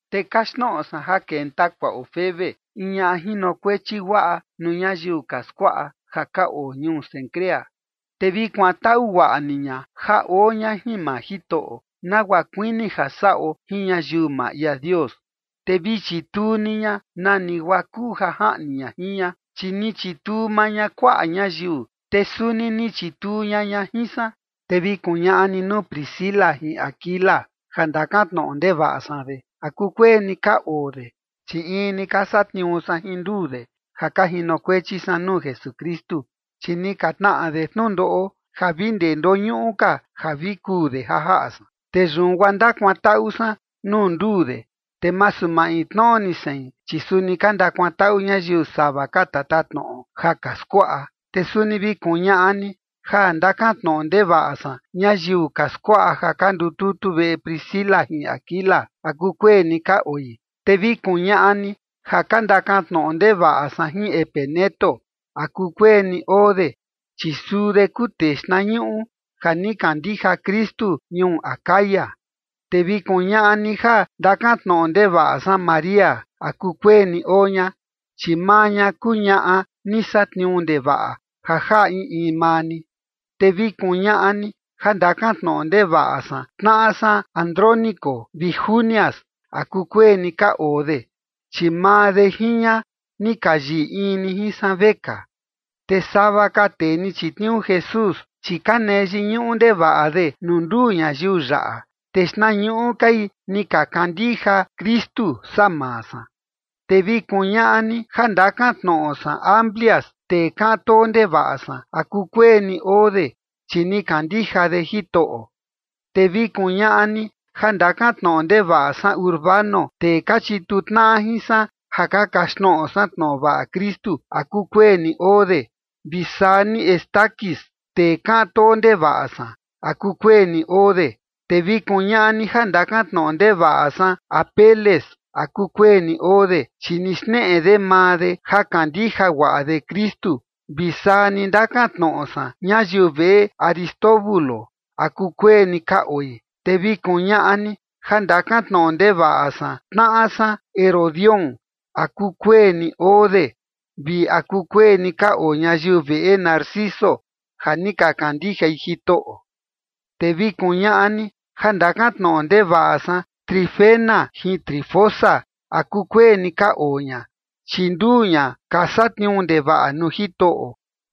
Te kaxtnoꞌo san ja kenta kuaꞌo Febe, in ñaꞌa jinokuechi guaꞌa nuu ñayiu ka skuaꞌa ja ka oo ñuu Cencrea. Te vi kuantaꞌu guaꞌa ni ña ja oo ña jin maa Jitoꞌo, nagua kuini ja saꞌo jin ñayiu maa ia Dios, te vi chituu ni ña nani guaa kuu ja jaꞌni ña jin ña, chi ni chituu maa ña kuaꞌa ñayiu, te suni ni chituu ña ña jin san. Te vi kuñaꞌa ni nuu Priscila jin Aquila, ja ndakan tnoꞌo ndevaꞌa san de, ¿a kukueni ka oo de?, chi in ni ka satniuu san jin nduu de ja ka jinokuechi san nuu Jesukristu. Chi ni ka tnaꞌa de tnundoꞌo ja vi ndee ndoñuꞌu ka ja vi kuu de ja jaꞌa san. Te yun guaa ndakuantaꞌu san nuu nduu de, te masu maintnoꞌo ni sein, chi suni ka ndakuantaꞌu ñayiu sava ka tatatnoꞌo ja ka skuaꞌa. Te suni vi kuñaꞌa ni ja ndakan tnoꞌo ndevaꞌa san ñayiu ka skuaꞌa ja ka ndututu veꞌe Priscila jin Aquila, ¿a kukueni ka oi? Te vi kuñaꞌa ni ja ndakan tnoꞌo ndevaꞌa san jin Epeneto, ¿a kukueni oo de? Chi suu de kuu tee xtnañuꞌu ja ni kandija Kristu ñuu Acaya. Te vi kuñaꞌa ni ja ndakan tnoꞌo ndevaꞌa san María, ¿a kukueni oo ña? Chi maa ña kuu ñaꞌa ni satniuu ndevaꞌa ja jaꞌa in in maa ni. Te vi kuñaꞌa ni ja ndakan tnoꞌo ndevaꞌa san tnaꞌa san Andrónico vi Junias, ¿a kukueni ka oo de? Chi maa de jin ña ni ka yiꞌi in ni jin san vekaa. Te sava ka tee ni chitniuu Jesús, chi ka nee yiñuꞌu ndevaꞌa de nuu nduu ñayiu yaꞌa, te xtnañuꞌu kai ni ka kandija Kristu saa maa san. Te vi kuñaꞌa ni ja ndakan tnoꞌo san Amplias, tee kaꞌan too ndevaꞌa san, ¿a kukueni oo de? Chi ni kandija de Jitoꞌo. Te vi kuñaꞌa ni ja ndakan tnoꞌo ndevaꞌa san Urbano, tee ka chituu tnaꞌa jin san ja ka kaxtnoꞌo san tnoꞌo vaꞌa Kristu, ¿a kukueni oo de? Vi saa ni Estaquis, tee kaꞌan too ndevaꞌa san, ¿a kukueni oo de? Te vi kuñaꞌa ni ja ndakan tnoꞌo ndevaꞌa san Apeles, ¿a kukueni oo de? Chi ni xneꞌe de maa de ja kandija guaꞌa de Kristu, vi saa ni ndakan tnoꞌo san ñayiu veꞌe Aristóbulo, ¿a kukueni ka oi? Te vi kuñaꞌa ni ja ndakan tnoꞌo ndevaꞌa san tnaꞌa san Herodión, ¿a kukueni oo de vi a kukueni ka oo ñayiu veꞌe Narciso, ja ni ka kandijai Jitoꞌo? Te vi kuñaꞌa ni ja ndakan tnoꞌo ndevaꞌa san Trifena jin Trifosa, ¿a kukueni ka oo ña? Chi nduu ña ka satniuu ndevaꞌa nuu Jitoꞌo.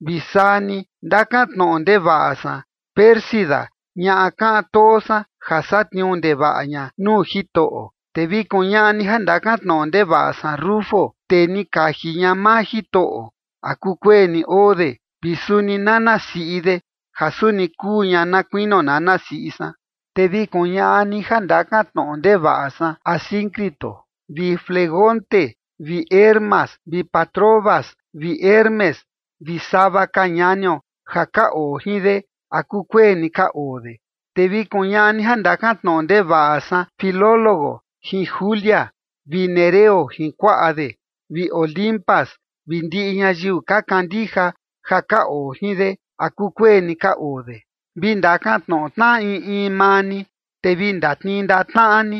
Vi saa ni ndakan tnoꞌo ndevaꞌa san Pérsida ñaꞌa kaꞌan too san, ja satniuu ndevaꞌa ña nuu Jitoꞌo. Te vi kuñaꞌa ni ja ndakan tnoꞌo ndevaꞌa san Rufo, tee ni kaji ña maa Jitoꞌo, ¿a kukueni oo de?, vi suni nana siꞌi de, ja suni kuu ña na kuinio nana siꞌi san. Te vi kuñaꞌa ni ja ndakan tnoꞌo ndevaꞌa san Asíncrito vi Flegonte vi Hermas vi Patrobas vi Hermes, vi sava ka ñanio ja ka oo jin de, ¿a kukueni ka oo de? Te vi kuñaꞌa ni ja ndakan tnoꞌo ndevaꞌa san Filólogo jin Julia vi Nereo jin kuaꞌa de, vi Olimpas vi ndiꞌi ñayiu ka kandija ja ka oo jin de, ¿a kukueni ka oo de? Vi ndakan tnoꞌo tnaꞌa in in maa ni, te vi ndatnii ndaꞌa tnaꞌa ni.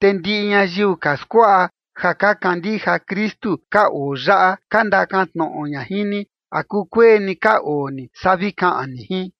Te ndiꞌi ñayiu ka skuaꞌa ja ka kandija Kristu ka oo yaꞌa ka ndakan tnoꞌo ña jin ni, ¿a kukueni ka oo ni? Saa vi kaꞌan ni jin.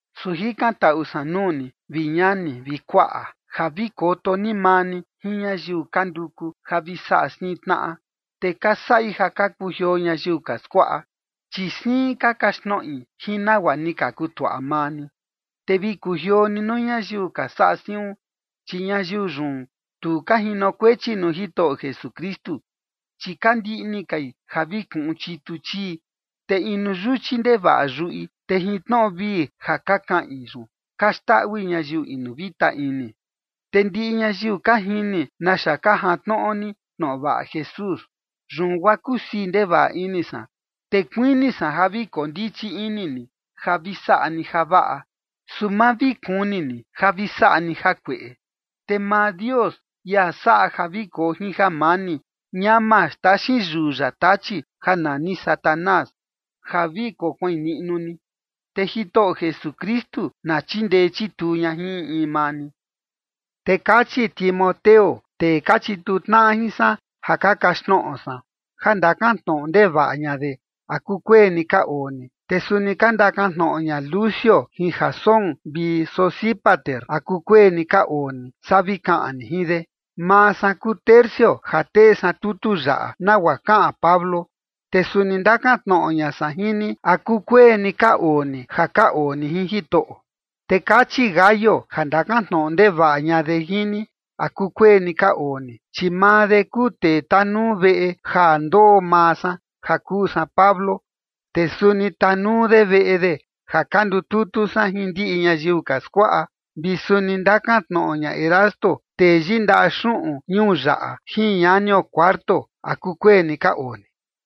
Su jikantaꞌu san nuu ni, vi ñani vi kuaꞌa, ja vi koto ni maa ni jin ñayiu ka nduku ja vi saꞌa siin tnaꞌa, te ka saꞌi ja ka kujioo ñayiu ka skuaꞌa, chi siin ka kaxtnoꞌi jin nagua ni ka kutuaꞌa maa ni. Te vi kujioo ni nuu ñayiu ka saꞌa siun. Chi ñayiu yun, tu ka jinokuechi nuu Jitoꞌo Jesukristu, chi ka ndiꞌni kai ja vi kuꞌun chitu chii, te inu yuchi ndevaꞌa yuꞌi, te jin tnoꞌo vii ja ka kaꞌin yun ka xndaꞌui ñayiu inu vita ini. Te ndiꞌi ñayiu ka jini naxa ka jantnoꞌo ni tnoꞌo vaꞌa Jesús, yun guaa kusii ndevaꞌa ini san, te kuini san ja vi kondichi ini ni, ja vi saꞌa ni javaꞌa, su ma vi kuni ni ja vi saꞌa ni jakueꞌe. Te maa Dios, ia saꞌa ja vi koo jin jamani, ñama xtaxin yuu ya Tachi ja nani Satanás ja vi kokuain niꞌnu ni. Te Jitoꞌo Jesukristu na chindee chituu ña jin in in maa ni. Te kachi Timoteo, tee ka chituu tnaꞌa jin san ja ka kaxtnoꞌo san, ja ndakan tnoꞌo ndevaꞌa ña de, ¿a kukueni ka oo ni? Te suni ka ndakan tnoꞌo ña Lucio vi Jasón vi Sosípater, ¿a kukueni ka oo ni? Saa vi kaꞌan ni jin de. Maa san kuu Tercio ja tee san tutu yaꞌa nagua kaꞌan Pablo, te suni ndakan tnoꞌo ña san jin ni, ¿a kukueni ka oo ni ja ka oo ni jin Jitoꞌo? Te kachi Gayo ja ndakan tnoꞌo ndevavaꞌa ña de jin ni, ¿a kukueni ka oo ni? Chi maa de kuu tee tanuu veꞌe ja ndoo maa san ja kuu san Pablo. Te suni tanuu de veꞌe de ja ka ndututu san jin ndiꞌi ñayiu ka skuaꞌa. Vi suni ndakan tnoꞌo ña Erasto, tee yindaꞌa xuꞌun ñuu yaꞌa jin ñanio Cuarto, ¿a kukueni ka oo ni?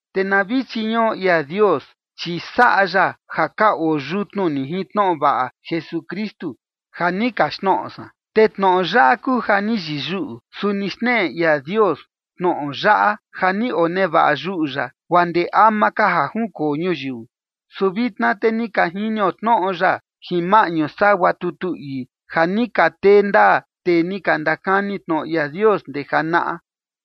Te na vi chiñuꞌo ia Dios, chi saꞌa ya ja ka oo yutnu ni jin tnoꞌo vaꞌa Jesukristu ja ni kaxtnoꞌo san. Te tnoꞌo yaꞌa kuu ja ni yiyuꞌu, su ni xneꞌe ia Dios tnoꞌo yaꞌa ja ni onevaꞌa yuꞌu ya guaa ndee ama ka ja junkoo ñuyiu. Su vitna te ni ka jinio tnoꞌo ya jin maꞌñu sagua tutu ii ja ni ka tee ndaa tee ni ka ndakani tnoꞌo ia Dios ndee janaꞌa,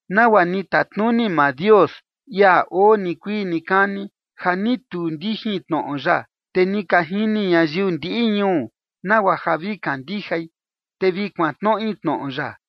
nagua ni tatnuni maa Dios, ia oo nikuii nikani, ja ni tuu ndijin tnoꞌo ya. Te ni ka jini ñayiu ndiꞌi ñuu nagua ja vi kandijai, te vi kuantnoꞌi tnoꞌo ya.